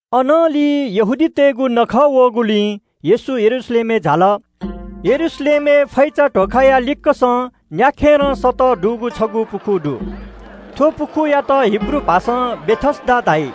अनंलि यहूदीतय्‌गु छगू नखः वःगुलिं येशू यरूशलेमय् झाल। यरूशलेमय् फै ध्‍वाखाया लिक्‍कसं न्‍याखेरं फः दुगु छगू पुखू दु। थ्‍व पुखूयात हिब्रू भाषां बेथेस्‍दा धाइ।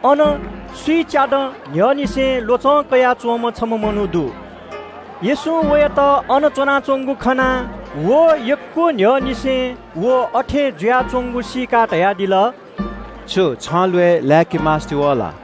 अन स्‍विच्‍यादँ न्‍ह्यःनिसें ल्‍वचं कयाच्‍वंम्‍ह छम्‍ह मनू दु। येशूं वयात खनाः अले यक्‍व दँ न्‍ह्यःनिसें व अथे जुयाच्‍वंगु सीकाः धयादिल – “छु छन्‍त ल्‍वय् लाय्‌के मास्‍ति वः ला?”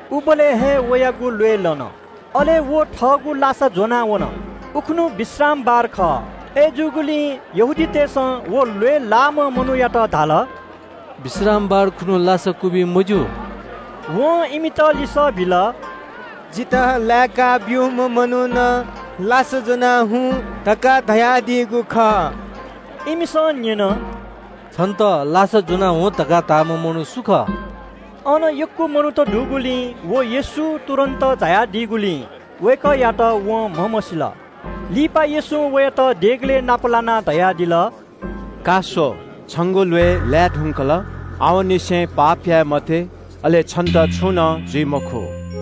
उबलय् हे वयागु ल्‍वय् लन। अले व थःगु लासा ज्‍वनाः न्‍यासि जुल। उखुन्‍हु विश्रामबार खः। अय्‌जूगुलिं यहूदीतय् नायःतय्‌सं व मनूयात धाल – “विश्रामबार खुन्‍हु लासा क्‍वबी मज्‍यू।” वं इमित लिसः बिल – “जितः लाय्‌का ब्‍यूम्‍ह मनुखं ‘लासा ज्‍वनाः हुँ’ धकाः धयादीगु खः।” इमिसं न्‍यन – “छन्‍त लासा ज्‍वनाः हुँ धकाः धाःम्‍ह मनू सु खः?” अन यक्‍व मनू दुगुलिं व येशू तुरुन्‍त झायादीगुलिं वय्‌कःयात वं म्‍हमसील। लिपा येशूं वयात देगलय् नाप लानाः धयादिल – “स्‍व, छंगु ल्‍वय् लाये धुंकल। आवंनिसें पाप याये मते, अले छन्‍त छुं नं जुइ मखु।”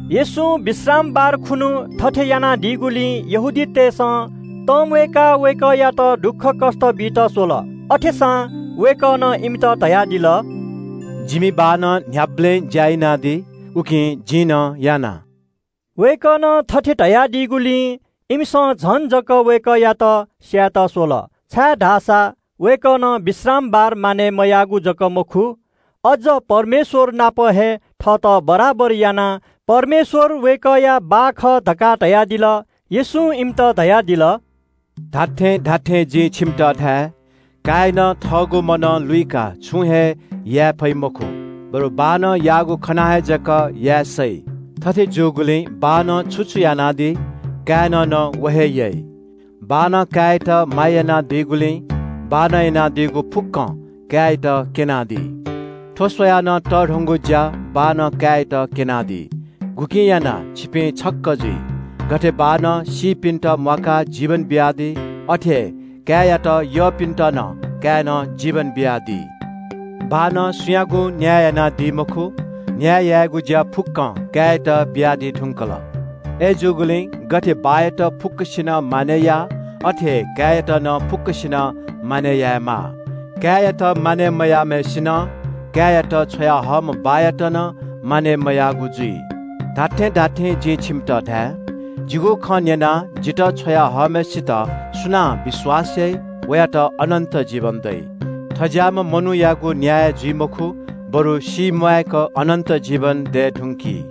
येशूं विश्रामबार खुन्‍हु थथे यानादीगुलिं यहूदीतय् नायःतय्‌सं वय्‌कःयात दुःख बियाहल। अथेसां वय्‌कलं इमित धयादिल – “जिमि बाःनं न्‍ह्याबलें ज्‍या यानादी, उकिं जिं नं ज्‍या यानाच्‍वने।” वय्‌कलं थथे धयादीगुलिं इमिसं वय्‌कःयात स्‍यायेत झन अप्‍वः कुतः यात। छाय्‌धाःसा वय्‌कलं विश्रामबार मानय् मयाःगु जक मखु, अज्‍ज परमेश्‍वर नाप हे थःत ज्‍वलिंज्‍वः यानाः परमेश्‍वरयात वय्‌कःया बाः खः धकाः धयादिल। येशूं इमित धयादिल – “जिं छिमित खःगु खँ धाये – काय्‌नं थःगु मनं लुइकाः छुं हे याये फइ मखु, बरु बाःनं याःगु खनाः हे जक याये सइ। थथे जूगुलिं बाःनं छु छु यानादी, काय्‌नं नं व हे याइ। बाःनं काय्‌यात माया यानादीगुलिं बाःनं यानादीगु फुक्‍कं काय्‌यात क्‍यनादी। थ्‍व स्‍वयाः नं तःधंगु ज्‍या बाःनं काय्‌यात क्‍यनादी, गुकिं यानाः छिपिं छक्‍क जुइ। गथे बाःनं सीपिन्‍त म्‍वाकाः जीवन बियादी, अथे हे काय्‌यात यःपिन्‍त नं काय्‌नं जीवन बियादी। बाःनं सुयागुं न्‍याय यानादी मखु। न्‍याय यायेगु अधिकार काय्‌यात बियादी धुंकल। अय्‌जूगुलिं गथे बाःयात फुक्‍कसिनं मानय् याः अथे हे काय्‌यात नं फुक्‍कसिनं मानय् यायेमाः। काय्‌यात मानय् मयाःम्‍हय्‌सिनं काय्‌यात छ्वयाहःम्‍ह बाःयात नं मानय् मयाःगु जुइ। “जिं छिमित खःगु खँ धाये – जिगु खँ न्‍यनाः जितः छ्वया हःम्‍हय्‌सित सुनां विश्‍वास याइ, वयात अनन्‍त जीवन दइ। थज्‍याःम्‍ह मनूयागु न्‍याय जुइ मखु, बरु सीम्‍वाय्‌क अनन्‍त जीवन दये धुंकी।”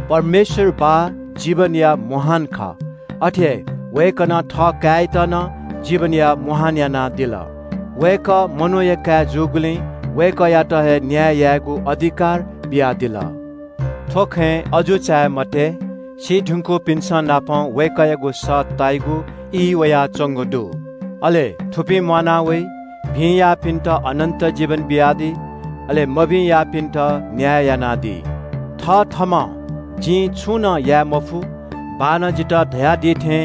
परमेश्‍वर बाः जीवनया मुहान खः, अथे हे वय्‌कलं थःकाय्‌यात नं जीवनया मुहान यानादिल। वय्‌कः मनूया काय् जूगुलिं वय्‌कःयात हे न्‍याय यायेगु अधिकार बियादिल। थ्‍व खँय् अजू चाये मते, सी धुंकूपिन्‍संनापं वय्‌कःयागु सः ताइगु ई वयाच्‍वंगु दु। अले थुपिं म्‍वाना वइ। भिं याःपिन्‍त अनन्‍त जीवन बियादी। अले मभिं याःपिन्‍त न्‍याय यानादी।” “थथःम्‍हं जिं छुं नं याये मफु, बाःनं जितः धयादी थें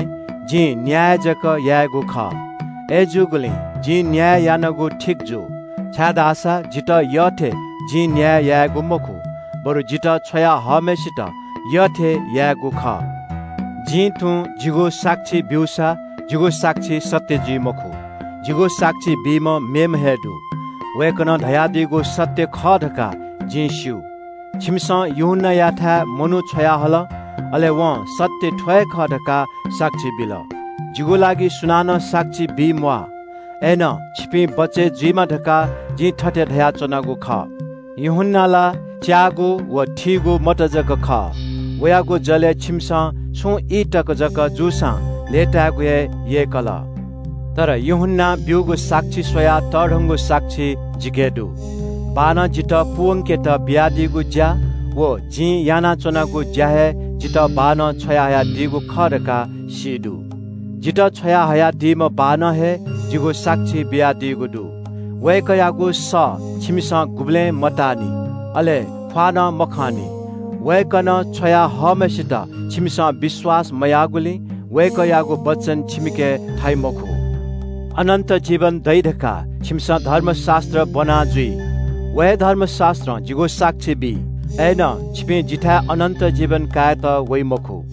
जिं न्‍याय जक यायेगु खः। अय्‌जूगुलिं जिं न्‍याय यानागु ठीक जू, छाय्‌धाःसा जितः यःथें जिं न्‍याय यायेगु मखु, बरु जितः छ्वया हःम्‍हय्‌सित यःथें यायेगु खः।” “जिं तुं जिगु साक्षी ब्‍यूसा जिगु साक्षी सत्‍य जुइ मखु। जिगु साक्षी बीम्‍ह मेम्‍ह हे दु, वय्‌कलं धयादीगु सत्‍य खः धकाः जिं स्‍यू। छिमिसं यूहन्‍नायाथाय् मनू छ्वयाहल, अले वं ‘सत्‍य थ्‍व हे खः’ धकाः साक्षी बिल। जिगु लागि सुनानं साक्षी बी म्‍वाः। अय्‌नं छिपिं बचय् जुइमा धकाः जिं थथे धयाच्‍वनागु खः। यूहन्‍ना ला च्‍याःगु व थीगु मत जक खः। वयागु जलय् छिमिसं छुं ई तक जक जूसां लय्‌ताय्‌गु हे यय्‌कल। तर यूहन्‍नां ब्‍यूगु साक्षी स्‍वयाः तःधंगु साक्षी जिके दु। बाःनं जितः पूवंकेत बियादीगु ज्‍या व जिं यानाच्‍वनागु ज्‍यां हे जितः बाःनं छ्वयाहयादीगु खः धकाः सी दु। जितः छ्वयाहयादीम्‍ह बाःनं हे जिगु साक्षी बियादीगु दु। वय्‌कःयागु सः छिमिसं गुबलें मताःनि, अले ख्‍वाः नं मखंनि। वय्‌कलं छ्वया हःम्‍हय्‌सित छिमिसं विश्‍वास मयाःगुलिं वय्‌कःयागु वचन छिमिके थाइ मखु। “अनन्‍त जीवन दइ धकाः छिमिसं धर्मशास्‍त्र ब्‍वना जुइ। व हे धर्मशास्‍त्रं जिगु साक्षी बी, अय्‌नं छिपिं जिथाय् अनन्‍त जीवन कायेत वइ मखु।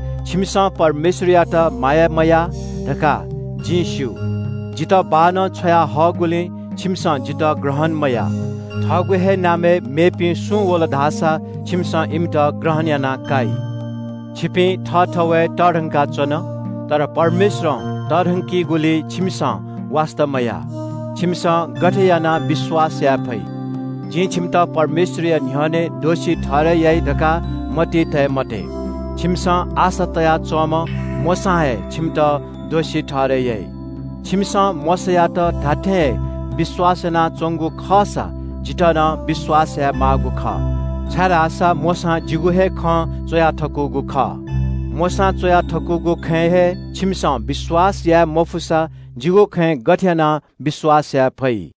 छिमिसं परमेश्‍वरयात माया मयाः धकाः जिं स्‍यू। जितः बाःनं छ्वयाहःगुलिं छिमिसं जितः थः नाला मकाः। थःगु हे नामय् मेपिं सुं वल धाःसा छिमिसं इमित ग्रहण याना काइ। छिमिसं थःथवय् तःधंका च्‍वन, तर परमेश्‍वरं तःधंकीगुलिइ छिमिसं वास्‍ता मया। छिमिसं गथे यानाः विश्‍वास याये फइ? “जिं छिमित परमेश्‍वरया न्‍ह्यःने दोषी ठहरय् याइ धकाः मतिइ तये मते। छिमिसं आशा तयाच्‍वंम्‍ह मोशां हे छिमित दोषी ठहरय् याइ। छिमिसं मोशायात धात्‍थें हे विश्‍वास यानाच्‍वंगु खःसा जितः नं विश्‍वास यायेमाःगु खः। छाय्‌धाःसा मोशां जिगु हे खँ च्‍वया थकूगु खः। मोशां च्‍वया थकूगु खँय् हे छिमिसं विश्‍वास मयासा जिगु खँय् गथे यानाः विश्‍वास याये फइ?”